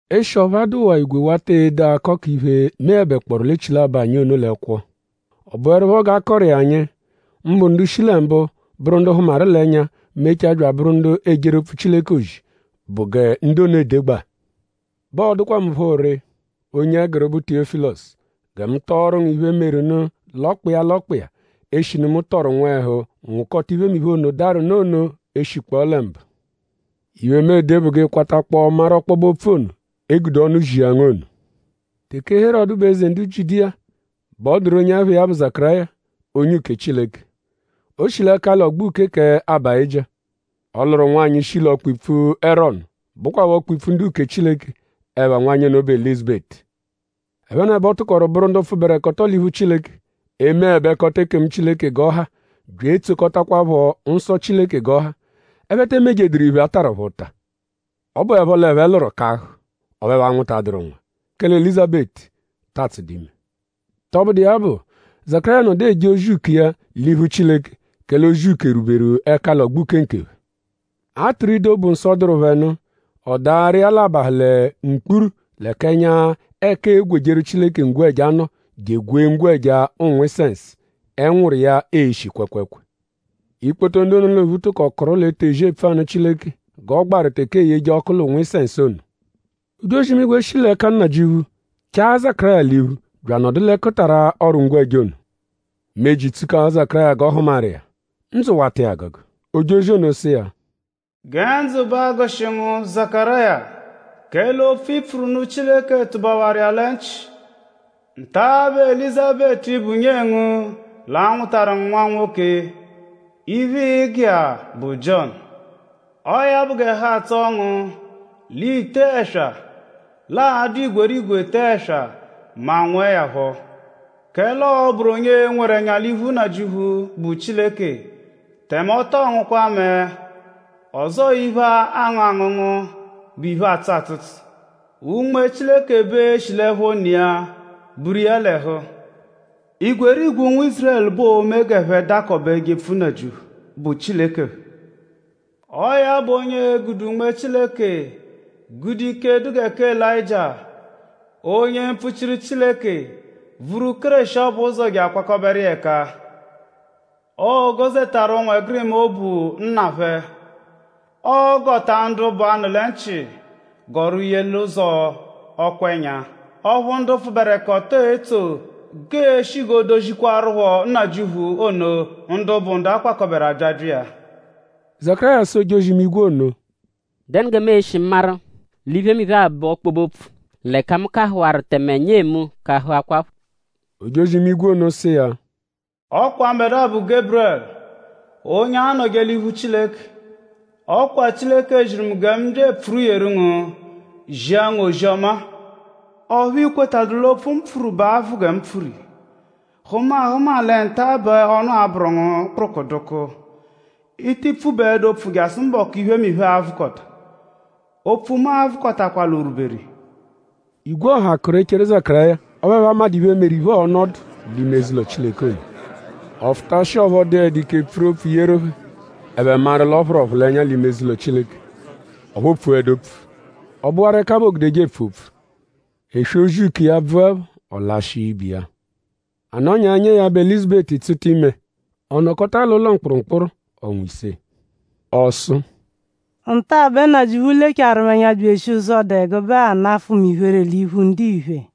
Eshi ọphu a dụwaa igwe wata ede akọ k'iphe, meẹbekpooru l'echilabọ anyi ono l'ẹkwo; ọ bụerupho g'a kọru iya anyi; mbụ ndu shi lẹ mbụ bụru ndu hụmaru l'ẹnya mechaa bya abụru ndu ejeru opfu Chileke ozi; bụ gẹ ndu ono edegbaa; bẹ ọ dụkwa mu phọ ree; onye ẹguru, bụ Tiyọ́filosu; gẹ mu tọoru ngu iphe, meru nụ l'ọkpa iya l'ọkpa iya; eshinu mu tọru nwẹhu nwụkota iphemiphe ono, daru nụ ono eshikpọo lẹ mbụ. Iphe, mu ede bụ g'ị kwatakpọo maru ọkpobe-opfu ono, e gude ọnu zia ngu ono. Teke Herọdu bụ eze ndu Jiudiya bẹ ọ dụru onye ẹpha iya bụ Zakaráya, onye uke Chileke. O shi l'ẹkali ọgbo uke kẹ Abáyijia. Ọ lụru nwanyị, shi l'ọkpa-ipfu Erọnu, bụkwapho ọkpa-ipfu ndu-uke Chileke. Ẹpha nwanyị ono bụ Elízabetu. Ẹphenebo tụkoru bụru ndu pfụberekoto l'iphu Chileke; emeẹbekota ekemu Chileke g'ọ ha bya etsokọtakwapho nsọ Chileke g'ọ ha. Ẹphe te emejeduru iphe, a tarụ phẹ ụta. Ọ bụepho l'ẹphe lụru kahụ; ọphu ẹphe anwụtaduru nwa; kẹle Elízabetu ta atsụdu ime. Tọbudu iya bụ; Zakaráya nọdu eje ozi uke iya l'iphu Chileke; kẹle ozi uke rwuberu ẹkali ọgbo uke nkephẹ. A tụru ido, bụ nsọ, dụru phẹ nụ; ọ daaru iya l'abahụ lẹ mkpuru l'ẹka ẹnya ẹka eegwejeru Chileke ngwẹja nọ je egwee ngwẹja ụ̀nwù-isẹnsu, ẹnwuru iya eshi kwẹekweekwee. Ikpoto ndu ono l'ophu tụko kụru l'etezi epfu anụ Chileke g'ọ gbaru teke eeyeje ọku l'ụ̀nwù-isẹnsu ono. Ojozi-imigwe, shi l'ẹka Nnajịuphu chaa Zakaráya l'iphu bya anọdu l'ẹkutara ọru-ngwẹja ono. Meji tsukaha Zakaráya g'ọ hụmaru iya. Ndzụ wata iya agụgu. Ojozi ono sụ iya: “Gẹ ndzụ ba agụshi ngu Zakaráya; kẹle opfu, i pfuru nụ Chileke tụbawaru iya lẹ nchị. Nta-a bẹ Elízabetu, bụ nyee ngu l'a-nwụtaru ngu nwa-nwoke. Iphe, ịi-gụ iya bụ Jiọnu. Ọo ya bụ g'ẹhu atsọo ngu; l'i tee ẹswa; l'a-dụ igwerigwe tee ẹswa mẹ a -nwụe ya phọ. Kẹle ọo-bụru onye nweru ẹnya l'iphu Nnajịuphu, bụ Chileke; tẹme ọ tọo ngụkwa mẹe; ọzoo iphe, aangụ angụngu, bụ iphe, atsụ atsụtsu. Unme Chileke bẹ e-shi l'ẹpho ne iya buru iya l'ẹhu. Igwerigwe ụnwu Ízurẹlu bẹ oo-me g'ẹphe dakọbe jepfu Nnajịuphu, bụ Chileke phẹ. Ọo ya bụ onye e-gude Unme Chileke; gude ike, dụ gẹ kẹ Elayịjia, onye mpfuchiru Chileke vuru Kéreshi ọbu ụzo je akwakọberu iya ẹka. Ọo-gọ-zetaru ụnwegirima obu nna phẹ. Ọo-gọta ndu bụ 'anụ-lẹ-nchị gọru ye l'ụzo ọkwa-ẹnya, ọphu ndu pfụberekoto etso; g'ee-shi g'oo-dozikwarụpho Nnajịuphu ono ndu bụ ndu a-kwakọberu abyabya iya.” Zakaráya sụ ojozi-imigwe ono: “?Dẹnu gẹ mu e-shi maru l'iphemiphe-a bụ ọkpobe-opfu; l'ẹka mu kahụwaru; tẹme nyee mu kahụakwapho?” Ojozi-imigwe ono sụ iya: “Ọ kwa mbẹdua bụ Geburẹlu; onye anọje l'iphu Chileke. Ọ kwa Chileke ziru mu gẹ mu bya epfuru yeru ngu; zia ngu ozi-ọma-a; ọphu i kwetadụru l'opfu, mu pfuru bẹ a-vụ gẹ mu pfuru iya. Hụma ahụma; lẹ nta-a bẹ ọnu a-bụru ngu kpụrukudukuu. I tii pfubaẹdu opfu jasụ mbọku, iphemiphe-a a-vụkota. Opfu mu a-vụkotakwa l'o rwuberu iya.” Igwe ọha kụru eche Zakaráya; ọphu ẹphe amadụ iphe, meru iphe, ọono ọdu l'ime eze-ụlo Chileke ono. Ọ fụtashia; ọphu ọ dụedu ike pfuru opfu yeru phẹ; ẹphe maru l'ọ phụru ọphulenya l'ime eze-ụlo Chileke; ọphu o pfuẹdu opfu. Ọ bụwaru ẹka bẹ oogudeje epfu opfu. Eswe ozi uke iya -bvụepho; ọ lashịa ibe iya. A nọnya; nyee ya, bụ Elízabetu tsụta ime. Ọ nọkota l'ụlo mkpụrumkpuru ọnwa ise. Ọ sụ: “Nta-a bẹ Nnajịuphu lecharu mu ẹnya bya eshia ụzo, dụ ẹgube-a nafụ mu iphere l'iphu ndiphe.”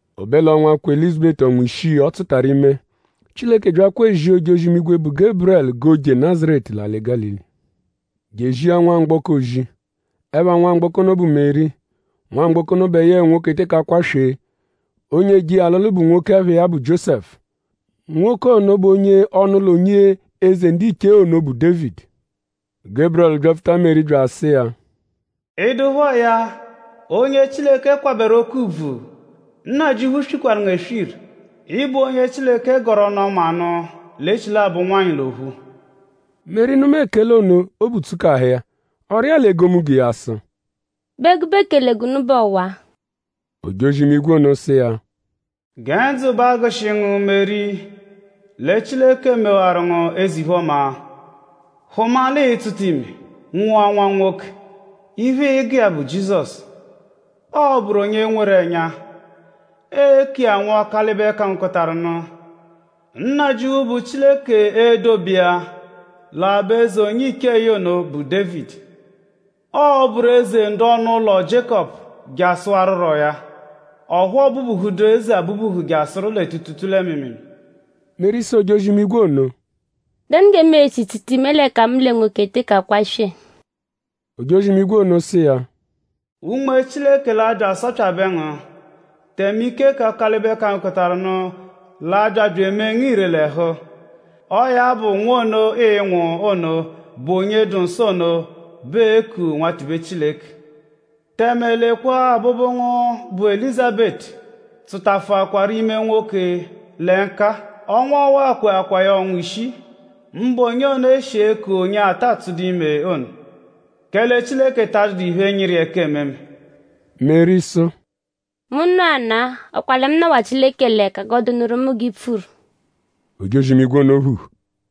O be l'ọnwa, kwe Elízabetu ọnwa ishii, ọ tsụtaru ime; Chileke byakwa ezia ojozi-imigwe, bụ Geburẹlu g'o je Nazaretu l'alị Gálili je ezia nwamgbọko ozi. Ẹpha nwamgbọko ono bụ Meri. Nwamgbọko ono bẹ yẹe nwoke teke akwaswee. Onye eje iya alụlu bụ nwoke, ẹpha iya bụ Jiósẹfu. Nwoke ono bụ onye ọnu-ụlo onye eze ndiche ono, bụ Dévidi. Geburẹlu byapfuta Meri bya sụ iya: “?Ị dụpho ya? Onye Chileke kwabẹru oke ùbvù! Nnajịuphu swikwaru ngu eswiru. Ị bụ onye Chileke gọru ọnu-ọma nụ l'echilabọ ụnwanyi l'ophu.” Meri nụma ekele ono; obu tsukahụ iya. Ọ rịa l'egomunggo iya sụ: “?Bụ ẹgube ekele gụnu bụ ọwa?” Ojozi-imigwe ono sụ iya: “Gẹ ndzụ ba agụshi ngu Meri; lẹ Chileke mewaru ngu eze-iphe-ọma. Hụma l'ịi-tsụta ime; nwụa nwa-nwoke; iphe, ịi-gụ iya bụ Jizọsu. Ọo-bụru onye nweru ẹnya. Ee-ku iya Nwa Ọkalibe-kangokọtaru-nụ. Nnajịuphu, bụ Chileke e-dobe iya l'aba-eze onye-iche iya ono, bụ Dévidi. Ọo-bụru eze ndu ọnu-ụlo Jiékọpu jasụwaruro ya; ọphu ọ bubuhuduru eze abubuhu jasụ lẹ tuutuutuu lẹ mịimiimii.” Meri sụ ojozi-imigwe ono: “?Dẹnu gẹ mu e-shi tsụta ime l'ẹka mu lẹ nwoke eteke akwaswee?” Ojozi-imigwe ono sụ iya: “Unme Chileke l'a-bya asọpyabe ngu; tẹme ike kẹ Ọkalibe-kangokọtaru-nụ l'a-bya bya emee ngu ire l'ẹhu. Ọo ya bụ; nwa ono, ịi-nwụ ono, bụ onye dụ nsọ ono bẹ ee-ku Nwatibe Chileke. Tẹme; lekwa abụbu ngu, bụ Elízabetu tsụtafuakwaru ime nwoke lẹ nka-a. Ọnwa ọwa kweakwaa ya ọnwa ishii; mbụ onye ono, e shi eku onye ata tsụdu ime ono; kẹle Chileke ta adụdu iphe, nyịru iya ẹka ememe.” Meri sụ: “Mu nọana-a!?Ọ kwa lẹ mu nọwa Chileke l'ẹka. G'ọ dụnuru mu g'i pfuru.” Ojozi-imigwe ono phuhu.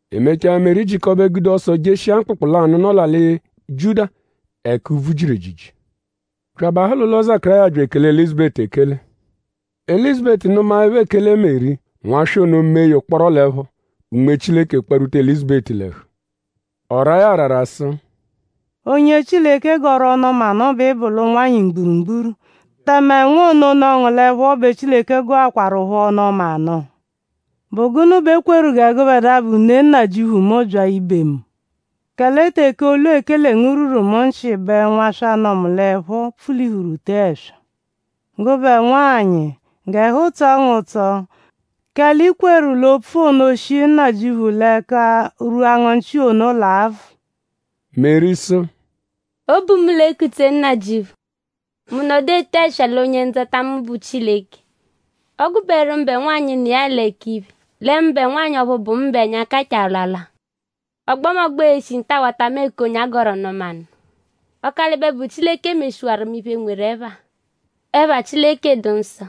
E mechaa; Meri jịkobe gude ọso jeshia mkpụkpu lanụ, nọ l'alị Jiuda ẹka úbvú jiru ejiji bya abahụ l'ụlo Zakaráya bya ekele Elízabetu ekele. Elízabetu nụmaepho ekele Meri; nwaswa ono mee ya ụkporo l'ẹpho. Unme Chileke kparwuta Elízabetu l'ẹhu. Ọ raa ya arara sụ: “Onye Chileke gọru ọnu-ọma nụ bẹ ị bụ l'ụnwanyi mgburugburu; tẹme nwa ono, nọ ngu l'ẹpho ono bẹ Chileke gọkwarupho ọnu-ọma nụ. ?Bụ gụnu bẹ e kweru gẹ gụbedua, bụ ne Nnajịuphu mu bya ibe mu? Kẹle teke olu ekele ngu rwuru mu lẹ nchị bẹ nwaswa, nọ mu l'ẹpho pfulihuru tee ẹswa. Gụbe nwanyị; g'ẹhu tsọ ngu ụtso; kẹle i kweru l'opfu ono, shi Nnajịuphu l'ẹka rwua ngu nchị ono l'a-vụ.” Meri sụ: “Obu mu l'ekutse Nnajịuphu. Mu nọdu ete ẹswa lẹ Onye-Ndzọta mu, bụ Chileke. Ọ gụberu mụbe nwanyị, nọ iya l'ẹka iphe; lẹ mụbe nwanyị ọphu bụ mu bẹ ẹnya kachaa alwalwa. Ọgbomogbo e-shi nta-a wata mu eku onye a gọru ọnu-ọma nụ. Ọkalibe, bụ Chileke meshiwaru mu iphe, nweru ẹpha. Ẹpha Chileke dụ nsọ.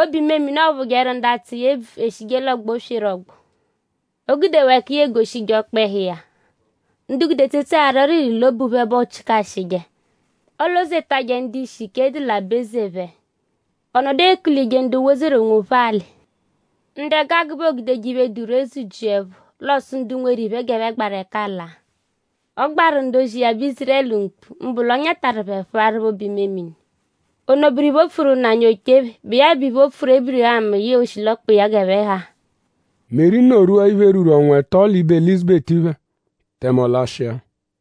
Obu-imemini, ọophujeru ndu atsụ iya ebvu eshije l'ọgbo sweru ọgbo. O gudewaa ẹka iya egoshije ọkpehu iya. Ndu gude etsetse arị ọriri l'obu phẹ bẹ ọochikashije. Ọolo-zetajẹ ndu-ishi, ike dụ l'aba-eze phẹ. Ọ nọdu ekulije ndu wozeru onwophẹ alị. Ndu ẹgu agụ bẹ oogudeje iphe, dụ ree zụ-jia ẹpho; l'ọ sụ ndu nweru iphe g'ẹphe gbaru ẹka laa. Ọ gbaru ndu-ozi iya, bụ Ízurẹlu mkpu; mbụ l'ọ nyatarụ phẹ; phụaru phẹ obu-imemini. Ono bụru iphe, o pfuru nna anyi oche phẹ, bụ iya bụ iphe, o pfuru Ébirihamu yẹe oshilọkpa iya g'ẹphe ha.” Meri nọ-rwua iphe, rwuru ọnwa ẹto l'ibe Elízabetu phẹ; tẹme ọ lashịa.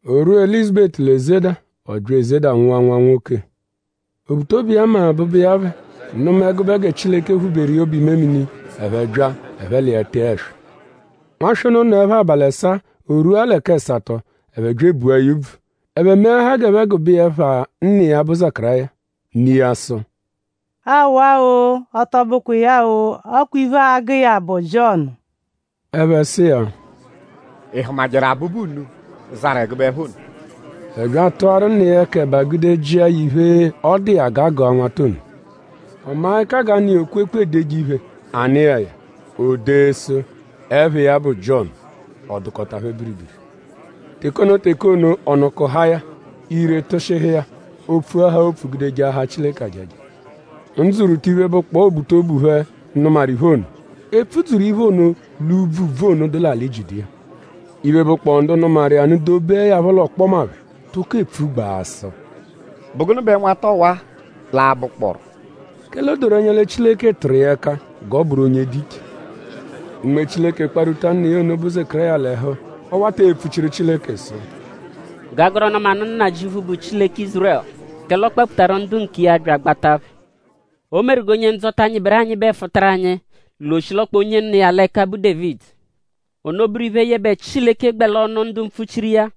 O rwua Elízabetu l'ezeda; ọ bya ezeda; nwụa nwa-nwoke. Obutobu iya mẹ abụbu iya phẹ; nụma ẹgube gẹ Chileke phụ-beru iya obu-imemini; ẹphe bya; ẹphe l'iya tee ẹswa. Nwaswa ono nọepho abalị ẹsaa; o rwua lẹ k'ẹsato; ẹphe bya ebua ya úbvù. Ẹphe meahaa g'ẹphe gụbe iya ẹpha nna iya, bụ Zakaráya. Ne iya sụ: “Awa-o. Ọ tọ bụkwa iya-o. Ọ kwa iphe, aa-gụ iya bụ Jiọnu.” Ẹphe sụ iya: “?Ị hụmajeru abụbu unu, zarụ ẹgube ẹpha ono?” Ẹphe bya atụaru nna iya ẹka ẹba gude jịa ya iphe, ọ dụ iya g'a gụa nwata ono. Ọ maa ẹka g'a nụ iya okwekpu, eedeje iphe. A nụ iya ya; o dee sụ: “Ẹpha iya bụ Jiọnu.” Ọ dụkota phẹ biribiri. Teke ono teke ono; ọnu kụhaa ya; ire tụshihu iya. O pfuahaa opfu gude jaahaa Chileke ajaja. Ndzụ rwuta iphe, bụkpoo obutobu phẹ, nụmaru iphe ono. E pfudzuru iphe ono l'úbvú úbvú ono, dụ l'alị Jiudiya. Iphe, bụkpoo ndu nụmaru iya nụ dobeẹ ya phọ l'ọkpoma phẹ; tụko epfugbaa sụ: “?Bụ gụnu bẹ nwata ọwa-a l'a-bụkpooru?” kẹle o doru ẹnya lẹ Chileke tụru iya ẹka; g'ọ bụru onye dụ iche. Unme Chileke kparwuta nna iya ono, bụ Zakaráya l'ẹhu; ọ wata epfuchiru Chileke sụ: G'a gọru ọnu-ọma nụ Nnajịuphu, bụ Chileke Ízurẹlu; kẹle ọ kpapfutaru ndu nkiya bya agbata phẹ. O meru gẹ Onye-Ndzọta, nyịberu anyịbe fụtaru anyi l'oshilọkpa onye nọ iya l'ẹka, bụ Dévidi. Ono bụru iphe, yẹbe Chileke gbẹ l'ọnu ndu mpfuchiru iya,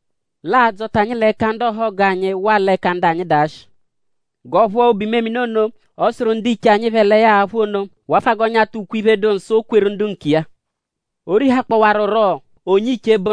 l'aa-dzọta anyi l'ẹka ndu ọhogu anyi waa l'ẹka ndu anyi dụ ashị; g'ọo-phụa obu-imemini ono, ọ sụru ndiche anyi phẹ lẹ ya a-phụ ono; wafụa g'ọo-nyata ukwe-iphe, dụ nsọ, o kweru ndu nkiya. O rihakpọwaruro onye-iche,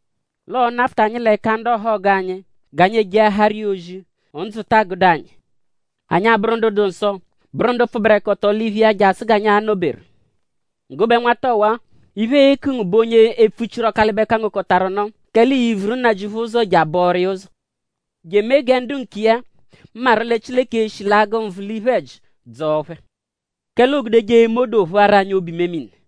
l'ọo-nafụta anyi l'ẹka ndu ọhogu anyi; g'anyi ejeahaaru iya ozi; ndzụ taa gụdu anyi; anyi abụru ndu dụ nsọ; bụru ndu pfụberekoto l'iphu iya jasụ g'anyi a-nọ-beru. “Gụbe nwata ọwa-a; Iphe, ee-ku ngu bụ onye epfuchiru Ọkalibe-kangokọtaru-nụ; kẹle ii-vuru Nnajịuphu ụzo je abọoru iya ụzo; je emee gẹ ndu nkiya maru lẹ Chileke e-shi l'agụ nvụ l'iphe-ẹji dzọo phẹ; kẹle oogudeje eme odoo phụaru anyi obu-imemini.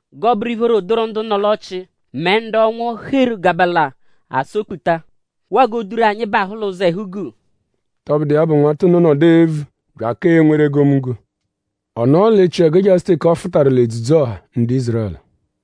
g'ọo-bụru ìphóró, dụru ndu nọ l'ọchii mẹ ndu ọnwu heru gabala asọ-kputa; waa g'oo-duru anyi bahụ l'ụzo ẹhu-guu.” Tọbudu iya bụ; nwata ono nọdu evu; bya aka enweru egomunggo. Ọ nọo l'echiẹgu jasụ teke ọ fụtaru l'edzudzu-ọha ndu Ízurẹlu.